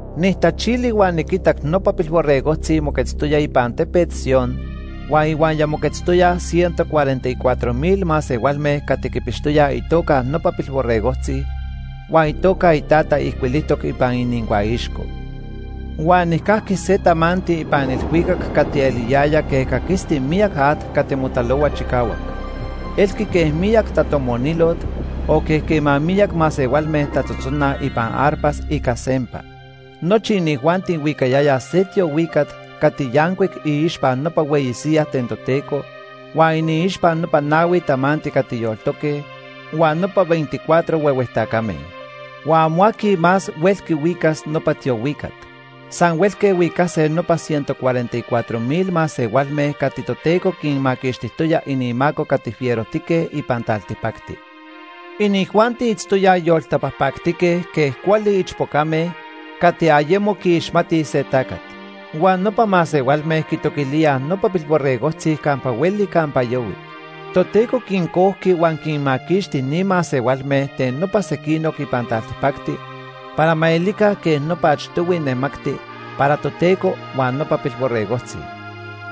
Nijtachili huan niquitac nopa Pilborregojtzi moquetztoya ipan Tepet Sion huan ihuaya moquetztoyaj ciento cuarenta y cuatro mil masehualme cati quipixtoyaj itoca nopa Pilborregojtzi huan itoca iTata ijcuilijtoc ipan inincuaixco. Huan nijcajqui se tamanti ipan ilhuicac cati eliyaya quej caquisti miyac at cati motalohua chicahuac. Elqui quej miyac tatomonilot, o quej quema miyac masehualme tatzotzonaj ipan arpas ica sempa. Nochi inijuanti huicayayaj se tiohuicat cati yancuic iixpa nopa hueyi siyaj ten Toteco huan iniixpa nopa nahui tamanti cati yoltoque huan nopa veinticuatro huehue tacame. Huan amo aqui más huelqui huicas nopa tiohuicat. San huelque huicase nopa ciento cuarenta y cuatro mil masehualme cati Toteco quinmaquixtijtoya inimaco cati fierojtique ipan taltipacti. Inijuanti itztoyaj yoltapajpactique quej cuali ichpocame cati ayemo quiixmatij se tacat. Huan nopa masehualme quitoquilíaj nopa Pilborregojtzi campa hueli campa yahui. Toteco quincojqui huan quinmaquixti ni masehualme ten nopa sequinoc ipan taltipacti para ma elica quej nopa achtohui nemacti para Toteco huan nopa Pilborregojtzi.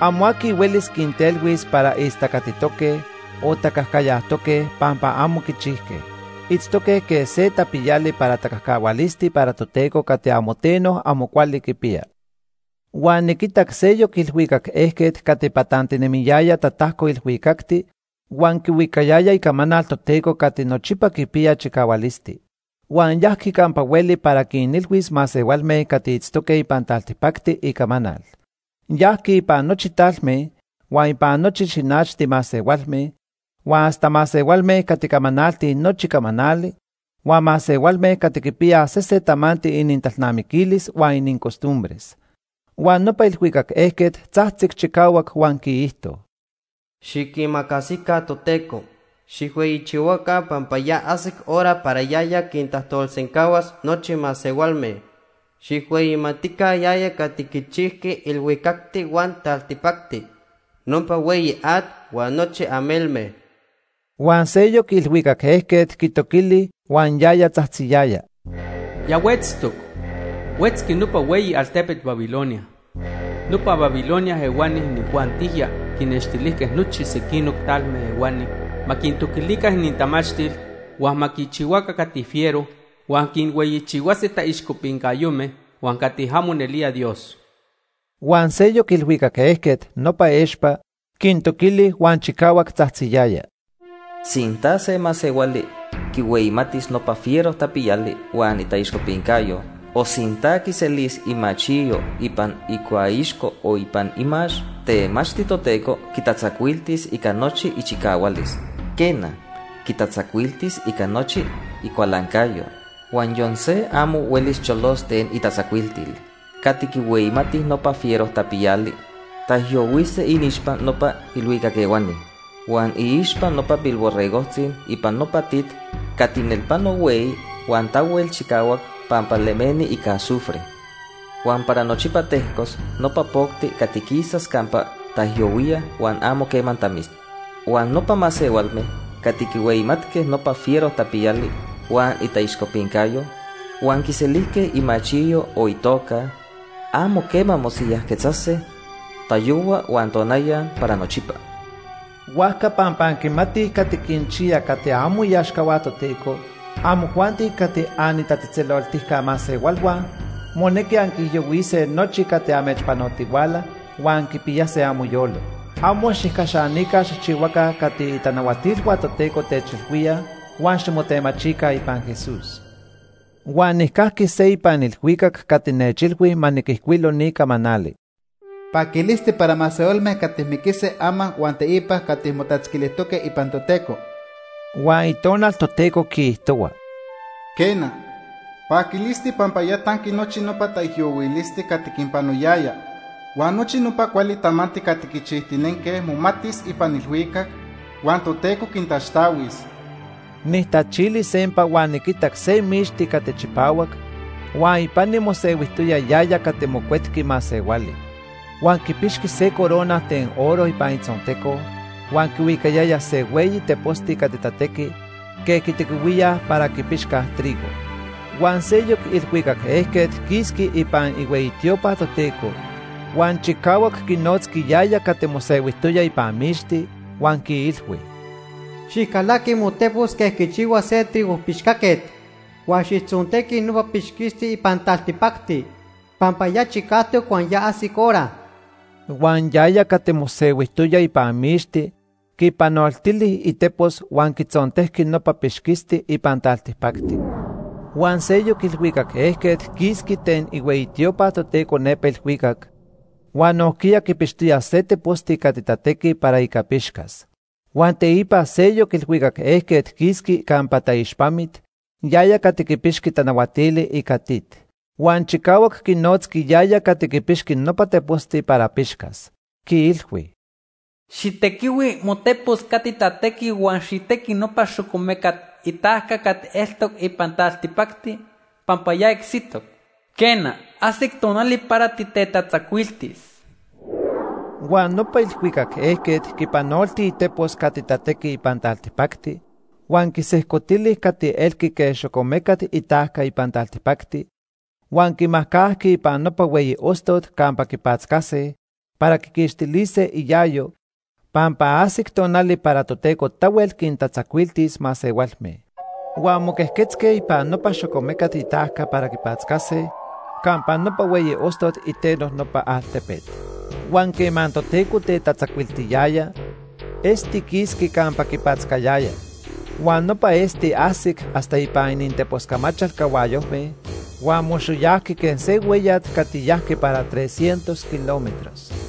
Amo aqui huelis quintelhuis para istacatitoque o tacajcayajtoque pampa amo quichijque. Itztoque quej se tapiyali para tacajcahualisti para Toteco cati amo teno amo cuali quipiya. Huan niquitac seyoc ilhuicac ejquet cati patantinemiyaya tatajco ilhuicacti huan quihuicayaya icamanal Toteco cati nochipa quipiya chicahualisti. Huan yajqui campa hueli para quinilhuis masehualme cati itztoque ipan taltipacti icamanal. Yajqui ipan nochi talme, huan ipan nochi xinachti masehualme, huan hasta masehualme cati camanaltij nochi camanali, huan masehualme cati quipiyaj sesen tamanti inintalnamiquilis huan inincostumbres. Huan nopa ilhuicac ejquet tzajtzic chicahuac huan quiijto: “Xiquimacasica Toteco. Xijhueyichihuaca pampa ya ajsic hora para yaya quintajtolsencahuas nochi masehualme. Xijhueyimatica yaya cati quichijqui ilhuicacti huan taltipacti, nopa hueyi at huan nochi amelme.” Huan seyoc ilhuicac ejquet quitoquili huan yaya tzajtziyaya: “Ya huetztoc. Huetzqui nopa hueyi altepet Babilonia. Nopa Babilonia ehuani inijuantijya quinnextilijque nochi sequinoc talme ehuani ma quintoquilica inintamachtil, huan ma quichihuaca cati fiero huan quinhueyichihuase taixcopincayome huan cati amo nelía Dios.” Huan seyoc ilhuicac ejquet, nopa expa, quintoquili huan chicahuac tzajtziyaya: “Sinta se masehuali quinhueyimatis nopa fiero tapiyali huan itaixcopincayo, o sinta quiselis imachiyo ipan icuaixco o ipan imax, temachti Toteco quitatzacuiltis ica nochi ichicahualis. Quena, quitatzacuiltis ica nochi icualancayo, huan yon se amo huelis cholos ten itatzacuiltil. Cati quihueyimatij nopa fiero tapiyali taijyohuise iniixpa nopa ilhuicac ehuani huan iixpa nopa Pilborregojtzi ipan nopa tit cati nelpano hueyi huan tahuel chicahuac pampa lemeni ica azufre. Huan para nochipa tejcos nopa pocti cati quisas campa taijyohuíaj huan amo quema tamis. Huan nopa masehualme cati quihueyimatque nopa fiero tapiyali huan itaixcopincayo, huan quiselijque imachiyo o itoca, amo quema mosiyajquetzase tayohua huan tonaya para nochipa.” Huajca pampa anquimatij cati quinchiya cati amo iaxcahua Toteco, amojuanti cati anitatzejtzeloltica masehualhua monequi anquiijyohuise nochi cati amechpanotihuala huan anquipiyase amoyolo. Amo xijcaxanica xijchihuaca cati itanahuatilhua Toteco techilhuíaj huan ximotemachica ipan Jesús. Huan nijcajqui se ipan ilhuicac cati nechilhui ma niquijcuilo ni camanali: “Paquilisti para masehualme cati miquise ama huan teipa cati motatzquilijtoque ipan Toteco.” Huan Itonal Toteco quiijtohua: “Quena, paquilisti pampa ya tanqui nochi nopa taijyohuilisti cati quinpanoyaya. Huan nochi nopa cuali tamanti cati quichijtinenque momatis ipan ilhuicac, huan Toteco quintaxtahuis.” Nijtachili sempa huan niquitac se mixti cati chipahuac huan ipani mosehuijtoya yaya cati Mocuetqui Masehuali. Huan quipixqui se corona ten oro ipan itzonteco huan quihuicayaya se hueyi teposti cati tatequi quej quitequihuíaj para quipixcaj trigo. Huan seyoc ilhuicac ejquet quisqui ipan ihueyi tiopa Toteco huan chicahuac quinotzqui yaya cati mosehuijtoya ipan mixti, huan quiilhui: “Xijcalaqui motepos quej quichihua se trigo pixcaquet huan xijtzontequi nopa pixquisti ipan taltipacti, pampa ya chicajtoc huan ya ajsic hora.” Huan yaya cati mosehuijtoya ipan mixti quipanoltili itepos huan quitzontejqui nopa pixquisti ipan taltipacti. Huan seyoc ilhuicac ejquet quisqui ten ihueyi tiopa Toteco nepa ilhuicac huan nojquiya quipixtoya se teposti cati tatequi para ica pixcas. Huan teipa seyoc ilhuicac ejquet quisqui campa taixpamit, yaya cati quipixqui tanahuatili ica tit. Huan chicahuac quinotzqui yaya cati quipixqui nopa teposti para pixcas. Quiilhui: “Xijtequihui motepos cati tatequi huan xijtequi nopa xocomecat itajca cati eltoc ipan taltipacti, pampa ya icsitoc. Quena, ajsic tonali para titetatzacuiltis.” Huan nopa ilhuicac ejquet quipanolti itepos cati tatequi ipan taltipacti huan quisejcotili cati elqui quej xocomecat itajca ipan taltipacti huan quimajcajqui ipan nopa hueyi ostot campa quipatzcase para quiquixtilise iayo, pampa ajsic tonali para Toteco tahuel quintatzacuiltis masehualme. Huan moquejquetzque ipan nopa xocomecat itajca para quipatzcase campa nopa hueyi ostot iteno nopa altepet. Huan quema Toteco tetatzacuiltiyaya, esti quisqui campa quipatzcayaya. Huan nopa esti ajsic hasta ipan ininteposcamachal cahuayojme huan moxoyajqui quej se hueyat cati yajqui para tres cientos kilómetros.